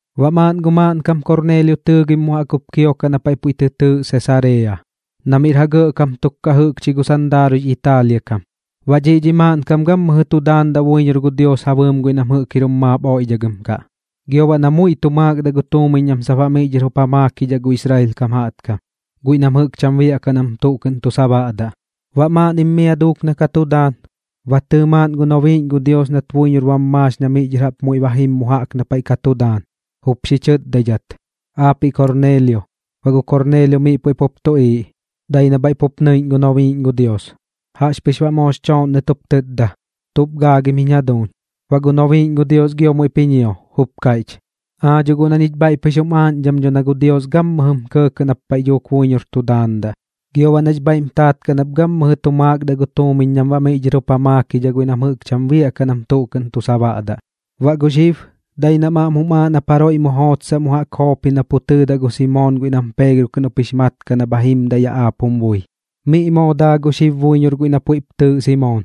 Baꞌ maaꞌn gu maaꞌnkam Korneelio tɨɨgim mu jaꞌk jup kiokaꞌ na paiꞌ puiꞌ tɨ tɨɨꞌ Sesareeya, na miꞌr ja gɇꞌkam tuk kaꞌ jɨꞌkchi gu sandaaruiꞌx Italia kam. Baꞌ dhiꞌ dhi maaꞌnkam gammɨjɨ tu daandaꞌ buiñor gu Dios ja bɨɨm guiꞌ nam jɨꞌk jir jum maap oiꞌdhagɨm kaꞌ, gio baꞌ na muiꞌ tu maakdaꞌ gu tuumiñ nam sap baꞌ miꞌ dhɨr jup ja maakidhaꞌ gu Israel kam jaꞌtkam, guiꞌ nam jɨꞌk cham biaꞌkaꞌ nam tuꞌ kɨꞌn tu sabaꞌdaꞌ. Baꞌ maaꞌnnim mia duuk na ka tu daan, ba tɨɨ maaꞌn gu nobiiꞌñ gu Dios nat buiñor bam maax na miꞌ dhɨr jaꞌp muiꞌ ba jim mu jaꞌk na paiꞌ ka tu daan, jup xi chɨtdaidhat: ―¡Aapiꞌ Korneelio! Baꞌ gu Korneelio miꞌ puiꞌ pup tuꞌiiꞌ, dai na bhaiꞌ pup nɨiꞌñ gu nobiiꞌñ gu Dios. Jaꞌxpɨx baꞌ moox chooꞌnnɨt jup tɨtda: ―¿Tuꞌp gaagim jiñ jaduuñ? Baꞌ gu nobiiꞌñ gu Dios gio muiꞌp ji ñio, jup kaiꞌch: ―Aa dho guꞌ na ñich bhaiꞌ pɨx jum aaꞌñdham dho na gu Dios gammɨjɨm kɇɇkɇꞌ nap paiꞌ dhuuk buiñor tu daandaꞌ, gio baꞌ nax bhaiꞌm taat kaꞌ nap gammɨjɨ tu maakdaꞌ gu tuumiñ nam baꞌ miꞌ dhɨr jup ja maakidhaꞌ guiꞌ nam jɨꞌk cham biaꞌkaꞌ nam tuꞌ kɨꞌn tu sabaꞌdaꞌ. Baꞌ gu xib, dai nam aꞌm jum aaꞌ nap jaroiꞌ mu jootsaꞌ mu jaꞌk Joopi na pu tɨɨdaꞌ gu Simoon guiꞌ nam Peegro kɨꞌn jup jix mat kaꞌ na bha jimdaꞌ yaꞌ aap jum bui. Miꞌ moo daa gu xib buiñor guiꞌ na puiꞌp tɨɨꞌ Simoon,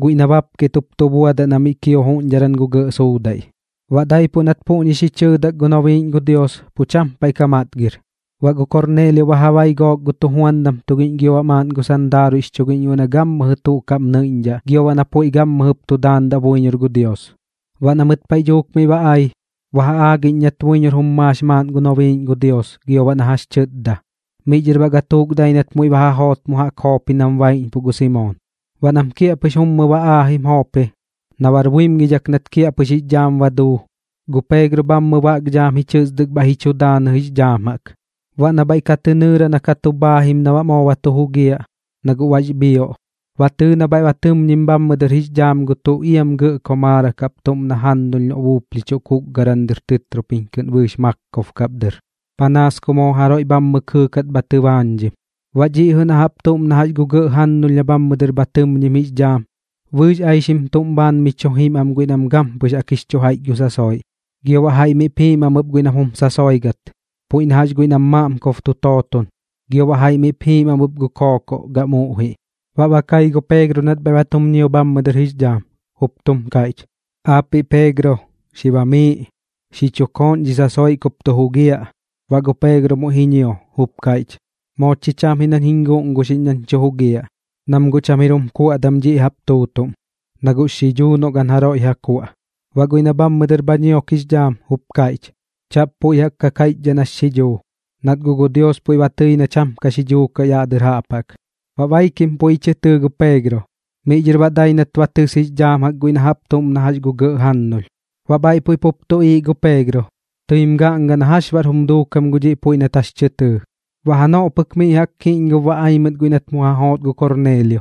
guiꞌ na bapket jup tu buadaꞌ na miꞌ kio juꞌñdharan gu gɇꞌ suudaiꞌ. Baꞌ daipuꞌ nat puꞌñi xi chɨɨdak gu nobiiꞌñ gu Dios, pu cham paiꞌ ka matgir. Baꞌ gu Korneelio ba ja bai gook gu tujuandam tugiꞌñ gio baꞌ maaꞌn gu sandaaruiꞌx chugiꞌñ guiꞌ na gammɨjɨ tuꞌ kaꞌm nɨiꞌñdhaꞌ gio baꞌ na puiꞌ gammɨjɨp tu daandaꞌ buiñor gu Dios. Baꞌ na mɨt paiꞌ dhuuk miꞌ ba ai, ba ja aagiꞌñ nat buiñor jum maax maaꞌn gu nobiiꞌñ gu Dios gio baꞌ na jax tɨtda. Miꞌ dhɨr baꞌ gatuuk dai nat muiꞌ ba ja joot mu jaꞌk Joopi nam sap baiꞌñpuꞌ gu Simoon. Baꞌ nam kiaꞌpɨx mummɨ ba aajim Joopi, na bar buimgidhak na kiaꞌpɨx jix dhaam ba duu, gu Peegro bhammɨ baꞌk dhaam ji chɨsdɨk bhaiꞌ ji chu daanɨ jix dhaam jaꞌk. Baꞌ na bhaiꞌ ka tɨ nɨɨra na ka tu bhaajim na baꞌ moo ba tu jugiaꞌ, na guꞌ bax bhioꞌ, ba tɨɨ na bhaiꞌ ba tɨmñim bhammɨ dɨr jix dhaam gu tuꞌ iam gɇꞌ komaarak jaꞌp tuꞌm na gu jannulh na buuplhichuꞌ kuukgaran dɨr tɨtropiñ kɨꞌn bɨɨx maakob kap dɨr, panaas ku moo jaroiꞌ bhammɨ kɨɨkat bha tɨbaañdhim. Baꞌ dhiꞌ jɨꞌ na jaꞌp tuꞌm na jax gu gɇꞌ jannulh na bhammɨ dɨr bha tɨmñim jix dhaam, bɨɨx aixim tuꞌm bhaan mi chu jiim am guiꞌ nam gampɨx jaꞌk jix chu jaiꞌch gu sasoiꞌ, gio baꞌ jaiꞌ miꞌp jiim am ɨp guiꞌ nam jum sasoigat, puiꞌ na jax guiꞌ nam maaꞌmkob tu tooton, gio baꞌ jaiꞌ miꞌp jiim am ɨp gu kookoꞌ gam uꞌjiꞌ. Baꞌ ba kai gu Peegro nat bhaiꞌ ba tum ñio bhammɨ dɨr jix dhaam, jup tum kaiꞌch: ―Aapiꞌ Peegro, xi bamiiꞌ, xi chu kooꞌn dhi sasoiꞌ kup tu jugiaꞌ. Baꞌ gu Peegro muiꞌ ji ñio, jup kaiꞌch: ―Moo chi cham ji nañ jiñ guꞌnguxiꞌñ nañ tu jugiaꞌ, nam guꞌ cham jir jum kuaꞌdam dhiꞌ jaꞌp tuutuꞌm, na guꞌx xidhuu noꞌ gan jaroiꞌ ja kuaꞌ. Baꞌ guiꞌ na bhammɨ dɨr bha ñiok jix dhaam jup kaiꞌch: ―Chaꞌp puiꞌ jaꞌk kaiꞌchdhaꞌ nax xidhuu, nat guꞌ gu Dios puiꞌ ba tɨi na cham tuꞌ ka xidhuu kaꞌ yaꞌ dɨr jaꞌp jaꞌk. Baꞌ baikim puiꞌ ji chɨ tɨɨ gu Peegro, miꞌ dhɨr baꞌ dai nat ba tɨs jix dhaam guiꞌ na jaꞌp tuꞌm na jax gu gɇꞌ jannulh. Baꞌ bhaiꞌ puiꞌ pup tuꞌiiꞌ gu Peegro, tɨim gaꞌnga na jax baꞌr jum duukam gu dhiꞌ puiꞌ nat jax tɨ tɨɨ. Baꞌ janoꞌ pɨk miꞌ jaꞌk kiꞌñgob ba ai mɨt guiꞌ nat mu ja joot gu Korneelio,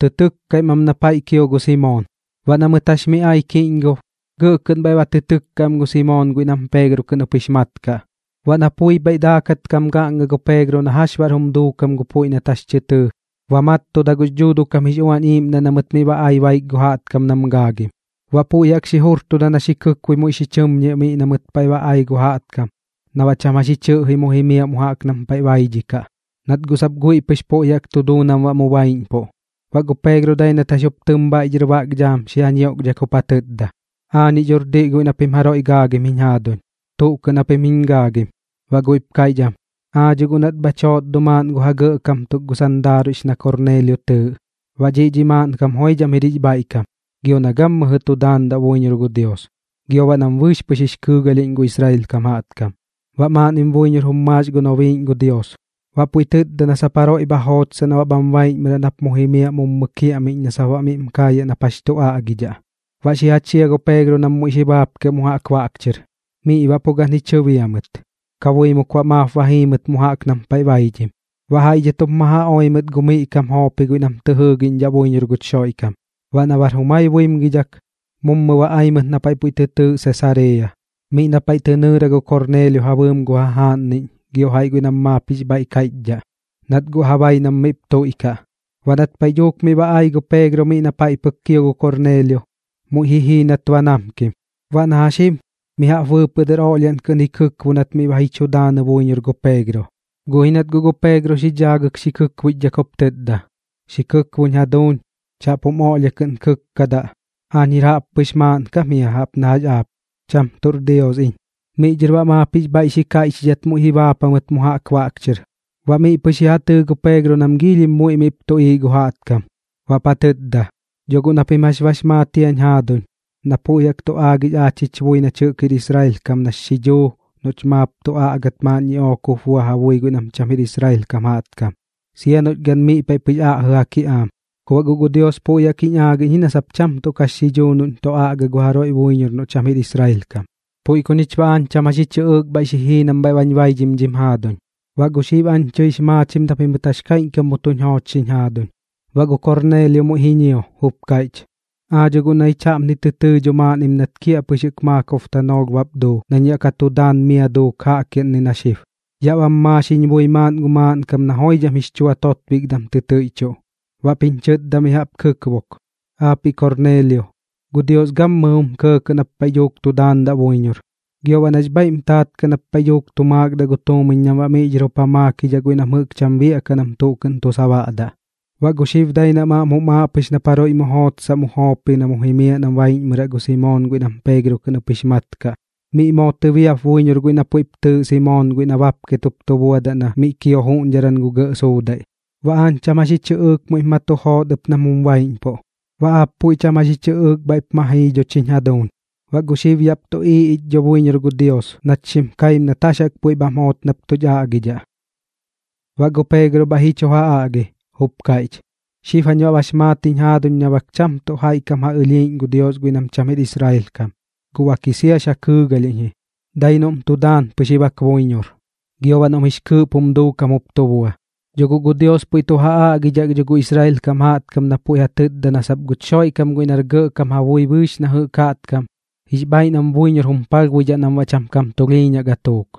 tɨ tɨkkaim am na paiꞌ kio gu Simoon. Baꞌ na mɨt jax mi ai kiꞌñgob, gɇꞌ kɨꞌn bhaiꞌ ba tɨ tɨkka am gu Simoon guiꞌ nam Peegro kɨꞌn jup jix mat kaꞌ. Baꞌ na pui bhaiꞌ daakat kam gaꞌnga gu Peegro na jax baꞌr jum duukam gu puiꞌ nat jax tɨ tɨɨ, ba mattuda gux Dhuuduꞌ kam jix Uañ Iiꞌmdaꞌ na mɨt miꞌ ba ai baik gu jaꞌtkam nam gaagim. Baꞌ puiꞌ jaꞌk xi jurtuda na xi kɨkbui muiꞌ xi chɨmñiaꞌ miꞌ na mɨt paiꞌ ba ai gu jaꞌtkam na baꞌ cham jax ji chɨꞌji mu jimiaꞌ mu jaꞌk nam paiꞌ baidhidhaꞌ, nat guꞌ sap guiꞌ pɨx puiꞌ jaꞌk tu duu nam baꞌ mu baiꞌñpuꞌ. Baꞌ gu Peegro dai nat jax jup tɨm bhaiꞌ dhɨr baꞌk dhaam xi ja ñioꞌkdhak jup ja tɨtda: ―Aañiꞌ dhor diꞌ guiꞌ na pim jaroiꞌ gaagim jiñ jaaduñ. ¿Tuꞌ kɨꞌn japim giñ gaagim? Baꞌ guiꞌp kaiꞌch am: ―Aa dho guꞌ nat bhach joot dho maaꞌn gu ja gɇꞌkam tuk gu sandaaruiꞌx na Korneelio tɨɨꞌ. Baꞌ dhiꞌ dhi maaꞌnkam joidham jir jix bhaiꞌkam, gio na gammɨjɨ tu daandaꞌ buiñor gu Dios, gio baꞌ nam bɨɨx pɨx jix kɨɨgalhiꞌñ gu Israel kam jaꞌtkam. Baꞌ maaꞌnnim buiñor jum maax gu nobiiꞌñ gu Dios, baꞌ puiꞌ tɨtda na sap jaroiꞌ bha jootsaꞌ na bham baiꞌñmɨraꞌ nap mu jimiaꞌ mummɨ kiaꞌmiꞌñ na sap baꞌ miꞌm kaayaꞌ nap jax tu aꞌgidhaꞌ. Baꞌ xi ja chia gu Peegro nam muiꞌ xi baapkiaꞌ mu jaꞌk baꞌk chɨr. Miꞌ baꞌ pu gan ji chɨbia mɨt, kabuimuk baꞌ maap ba jii mɨt mu jaꞌk nam paiꞌ baidhim. Baꞌ jaiꞌ dhɨt jup ma ja oi mɨt gu miꞌ kam Joopi guiꞌ nam jɨꞌk tɨ jɨɨgiꞌñdhaꞌ buiñor gu Xoiꞌkam. Baꞌ na bar jumai buimgidhak, mummɨ ba ai mɨt na paiꞌ puiꞌ tɨ tɨɨꞌ Sesareeya, miꞌ na paiꞌ tɨ nɨɨra gu Korneelio ja bɨɨm gu jajaaꞌnniꞌñ gio jaiꞌ guiꞌ nam maap jix bhaiꞌ kaiꞌchdhaꞌ, nat guꞌ ja bai nam miꞌp tuiꞌkaꞌ. Baꞌ nat paiꞌ dhuuk miꞌ ba ai gu Peegro miꞌ na paiꞌ pɨk kio gu Korneelio, muiꞌ ji jii nat ba namkim. Baꞌ na jax jim mi jaꞌp bɨɨpɨꞌ dɨr oꞌlhiaꞌn kɨꞌn ji kɨkbo nat miꞌ ba ji chu daanɨ buiñor gu Peegro. Guꞌ ji nat guꞌ gu Peegro xi dhaagɨk xi kɨkbuichdhak jup tɨtda: ―Xi kɨkboꞌñ jaduuñ, chaꞌp jum oꞌlhia kɨꞌn kɨkkadaꞌ. Aañ jir jaꞌppɨx maaꞌnkam jia jaꞌp na jax aap, cham tuꞌr Dios iñ. Miꞌ dhɨr baꞌ maap jix bhaiꞌ xi kaiꞌchidhat muiꞌ ji baap jamɨt mu jaꞌk baꞌk chɨr. Baꞌ miꞌ pɨx ji ja tɨɨ gu Peegro nam giilhim muiꞌ miꞌp tuꞌiiꞌ gu jaꞌtkam, baꞌp ja tɨtda: ―Dho guꞌ na pim jax bax maat jiañ jaaduñ na puiꞌ jaꞌk tu aagix aach jich bui nach jir Israel kam jaꞌtkam nax xidhuu noꞌch maap tu aꞌgat maaꞌn ñiꞌook jup bua ja bui guiꞌ nam cham jir Israel kam jaꞌtkam, sia noꞌch gan miꞌ paiꞌ pɨx aꞌjɨ ja kiꞌaam. Ku baꞌ guꞌ gu Dios puiꞌ jaꞌk jiñ aagiꞌñ ji na sap cham tuꞌ kax xidhuu noꞌñ tu aꞌga gu jaroiꞌ buiñor noꞌ cham jir Israel kam. Puiꞌ ku ñich baꞌ aañ cham jax ji chɨꞌɨɨk bhaiꞌ xi jii nam bhaiꞌ bañ baidhim dhim jaaduñ. Baꞌ gu xib aañ tɨix maachim na pimɨt jax kaiꞌñkam mu tuñ joochxiñ jaaduñ. Baꞌ gu Korneelio muiꞌ ji ñio, jup kaiꞌch: ―Aa dho guꞌ na ñich jaꞌpni tɨ tɨɨ dho maaꞌnnim nat kiaꞌpɨx jɨꞌk maakob tanoolh bap duu nañ yaꞌ ka tu daan mia duuk jaꞌkiaꞌnni na xib. Yaꞌ bam maax jiñ bui maaꞌn gu maaꞌnkam na joidham jix chua totbikdam tɨ tɨiꞌchuꞌ, baꞌp jiñ chɨtda mi jaꞌp ji kɨkbok: “Aapiꞌ Korneelio, gu Dios gammɨjɨ jum kɇɇkɇꞌ nap paiꞌ dhuuk tu daandaꞌ buiñor, gio baꞌ nax bhaiꞌm taat kaꞌ nap paiꞌ dhuuk tu maakdaꞌ gu tuumiñ nam baꞌ miꞌ dhɨr jup ja maakidhaꞌ guiꞌ nam jɨꞌk cham biaꞌkaꞌ nam tuꞌ kɨꞌn tu sabaꞌdaꞌ. Baꞌ gu xib dai nam aꞌm jum aaꞌ pɨx nap jaroiꞌ mu jootsaꞌ mu Joopi na mu jimiaꞌ na baiꞌñmɨraꞌ gu Simoon guiꞌ nam Peegro kɨꞌn jup jix mat kaꞌ. Miꞌ moo tɨbiap buiñor guiꞌ na puiꞌp tɨɨꞌ Simoon guiꞌ na bapket jup tu buadaꞌ na miꞌ kio juꞌñdharan gu gɇꞌ suudaiꞌ.” Baꞌ aañ cham jax ji chɨꞌɨɨk muiꞌp ma tu joot ɨp nam jum baiꞌñpuꞌ, baꞌ aap puiꞌ cham jax ji chɨꞌɨɨk bhaiꞌp ma jii dho chiñ jaduuñ. Baꞌ gu xib yaꞌp tuꞌiiꞌ ich dho buiñor gu Dios nach xim kaim nat jax jaꞌk puiꞌ bham joot nap tuꞌch aꞌgidhaꞌ. Baꞌ gu Peegro bhaiꞌ ji chu ja aꞌgi, jup kaiꞌch: ―Xib jañ baꞌ bax maat jiñ jaaduñ na bak cham tuꞌ jaiꞌ kam ja ɨlhiiꞌñ gu Dios guiꞌ nam cham jir Israel kam. Guꞌ bak ji siax ja kɨɨgalhiꞌñ ji, dai noꞌm tu daan pɨx ji bak buiñor, gio baꞌ noꞌm jix kɨɨꞌp jum duukam jup tu bua. Dho guꞌ gu Dios puiꞌ tu ja aꞌgidhak dho gu Israel kam jaꞌtkam na puiꞌ ja tɨtdadaꞌ na sap guch Xoiꞌkam guiꞌ nar gɇꞌkam ja bui bɨɨx na jɨꞌk jaꞌtkam, jix bhaiꞌ nam buiñor jum palhbuidhaꞌ nam baꞌ cham kam tulhiiñaꞌ gatuuk.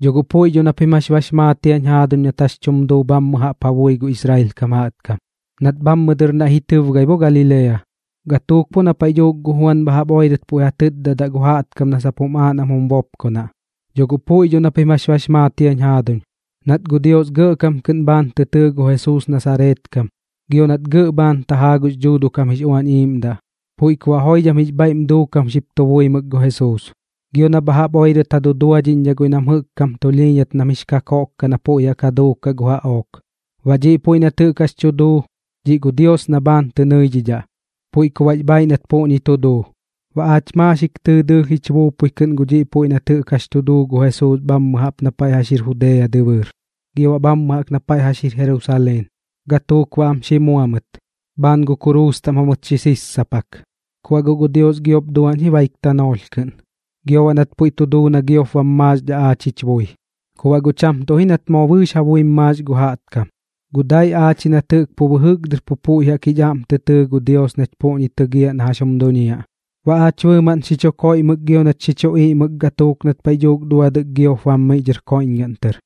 Dho guꞌ puiꞌ dho na pim jax bax maat jiañ jaaduñ nat jax chum duu bhammɨ jaꞌp ja bui gu Israel kam jaꞌtkam, nat bhammɨ dɨr naiꞌ jim tɨbgai bo Galilea, gatuuk bo na paiꞌ dhuuk gu Juan bha jaꞌp oirɨt puiꞌ ja tɨtdadaꞌ gu jaꞌtkam na sap jum aaꞌ nam jum bopkonaꞌ. Dho guꞌ puiꞌ dho na pim jax bax maat jiañ jaaduñ, nat gu Dios gɇꞌkam kɨꞌn bhaan tɨ tɨɨ gu Jesuus Nasareet kam gio nat gɇꞌ bhaan tajaa gux Dhuuduꞌ kam jix Uañ Iiꞌmdaꞌ, puiꞌ ku baꞌ joidham jix bhaiꞌm duukam xip tu buimɨk gu Jesuus, gio baꞌ na bha jaꞌp oirɨt ja duduaꞌñdhidhaꞌ guiꞌ nam jɨꞌk kam tulhiiñdhat nam jix kakoꞌk kaꞌ na puiꞌ jaꞌk ja duukaꞌ gu jaꞌook. Baꞌ dhiꞌ puiꞌ nat jɨꞌk jax tu duu, dhiꞌ gu Dios na bhaan tɨ nɨidhidhaꞌ, puiꞌ ku baꞌx bhaaiꞌ nat puꞌñi tu duu. Baꞌ aach maaxik tɨɨ dɨɨlh jich buupui kɨꞌn gu dhiꞌ puiꞌ nat jɨꞌk jax tu duu gu Jesuus bhammɨ jaꞌp na paiꞌ jax jir Judea dɨbɨɨr, gio baꞌ bhammɨ jaꞌk na paiꞌ jax jir Jerusaleen. Gatuuk baꞌ am xi mua mɨt, bhaan gu kuruus taꞌm jamɨt xi sissapak. Ku baꞌ guꞌ gu Dios giop duaꞌñ ji baik tanoolh kɨꞌn, gio baꞌ nat puiꞌ tu duu na giop bam maaxdhaꞌ aach jich bui. Ku baꞌ guꞌ cham tuꞌ ji nat moo bɨɨx ja buim maax gu jaꞌtkam, guꞌ dai aach ji nat jɨꞌk pu bɨjɨk dɨr pu puiꞌ jaꞌk jich aꞌm tɨ tɨɨ gu Dios nach puꞌñi tɨgiaꞌ na jax jum duñiaꞌ. Baꞌ aach bɨɨmaꞌn xi chu koiꞌmɨk gio nach xi chu iꞌmɨk gatuuk nat paiꞌ dhuuk duadɨk giop bam miꞌ dhɨr koiꞌñgaꞌn tɨr.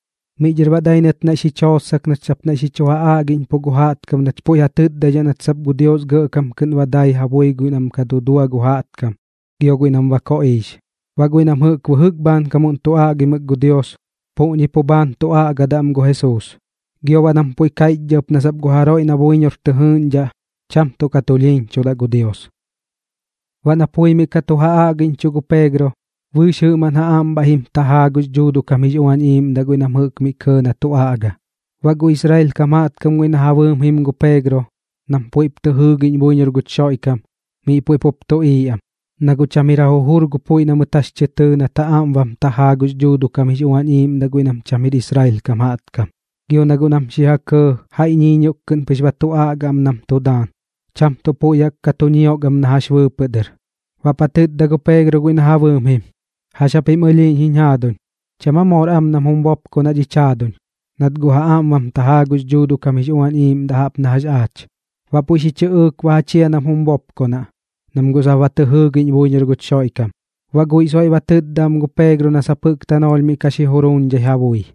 Miꞌ dhɨr baꞌ dai nat naiꞌ xich jootsak nach sap naiꞌ tu ja aꞌgiꞌñpuꞌ gu jaꞌtkam nach puiꞌ ja tɨtdaidhaꞌ nat sap gu Dios gɇꞌkam kɨꞌn ba dai ja bui guiꞌ nam ka dudua gu jaꞌtkam gio guiꞌ nam ba koꞌiix. Baꞌ guiꞌ nam jɨꞌk bɨjɨk bhaankamuꞌn tu aꞌgimɨk gu Dios, pu puꞌñi pu bhaan tu aꞌgadaꞌ am gu Jesuus, gio baꞌ nam puiꞌ kaiꞌchdhaꞌ ɨp na sap gu jaroiꞌ na buiñor tɨ jɨɨꞌñdhaꞌ, cham tuꞌ ka tulhiiñchudaꞌ gu Dios. Baꞌ na puiꞌ mi ka tu ja aꞌgiꞌñchuꞌ gu Peegro, bɨɨx jɨꞌmaꞌn ja aꞌm bhaiꞌ jim tajaa gux Dhuuduꞌ kam jix Uañ Iiꞌmdaꞌ guiꞌ nam jɨꞌk miꞌ kɇɇ na tu aꞌga. Baꞌ gu Israel kam jaꞌtkam guiꞌ na ja bɨɨm jim gu Peegro nam puiꞌp tɨ jɨɨgiꞌñ buiñor gu Xoiꞌkam, miꞌ puiꞌ pup tuꞌiiꞌ am, na guꞌ cham jir ja jujur gu puiꞌ na mɨt jax tɨ tɨɨ nat ja aꞌm jup bam tajaa gux Dhuuduꞌ kam jix Uañ Iiꞌmdaꞌ guiꞌ nam cham jir Israel kam jaꞌtkam. Gio na guꞌ nam xi ja kɇɇ jaiꞌ ñiiñioꞌk kɨꞌn pɨx ba tu aꞌga am nam tu daan, cham tuꞌ puiꞌ jaꞌk ka tu ñiok am na jax bɨɨpɨꞌ dɨr. Baꞌp ja tɨtda gu Peegro guiꞌ na ja bɨɨm jim: ―¿Jax japim ɨlhiiꞌñ jiñ jaaduñ? ¿Cham aa moor am nam jum bopkonaꞌ dhich jaaduñ, nat guꞌ ja aꞌm bam tajaa gux Dhuuduꞌ kam jix Uañ Iiꞌmdaꞌ jaꞌp na jax aach? Baꞌ puiꞌ xi chɨꞌɨɨk ba ja chia nam jum bopkonaꞌ, nam guꞌ sap ba tɨ jɨɨgiꞌñ buiñor gu Xoiꞌkam. Baꞌ guiꞌ soiꞌ ba tɨtda am gu Peegro na sap jɨꞌk tanoolh miꞌ ka xi juruuñdhai ja bui.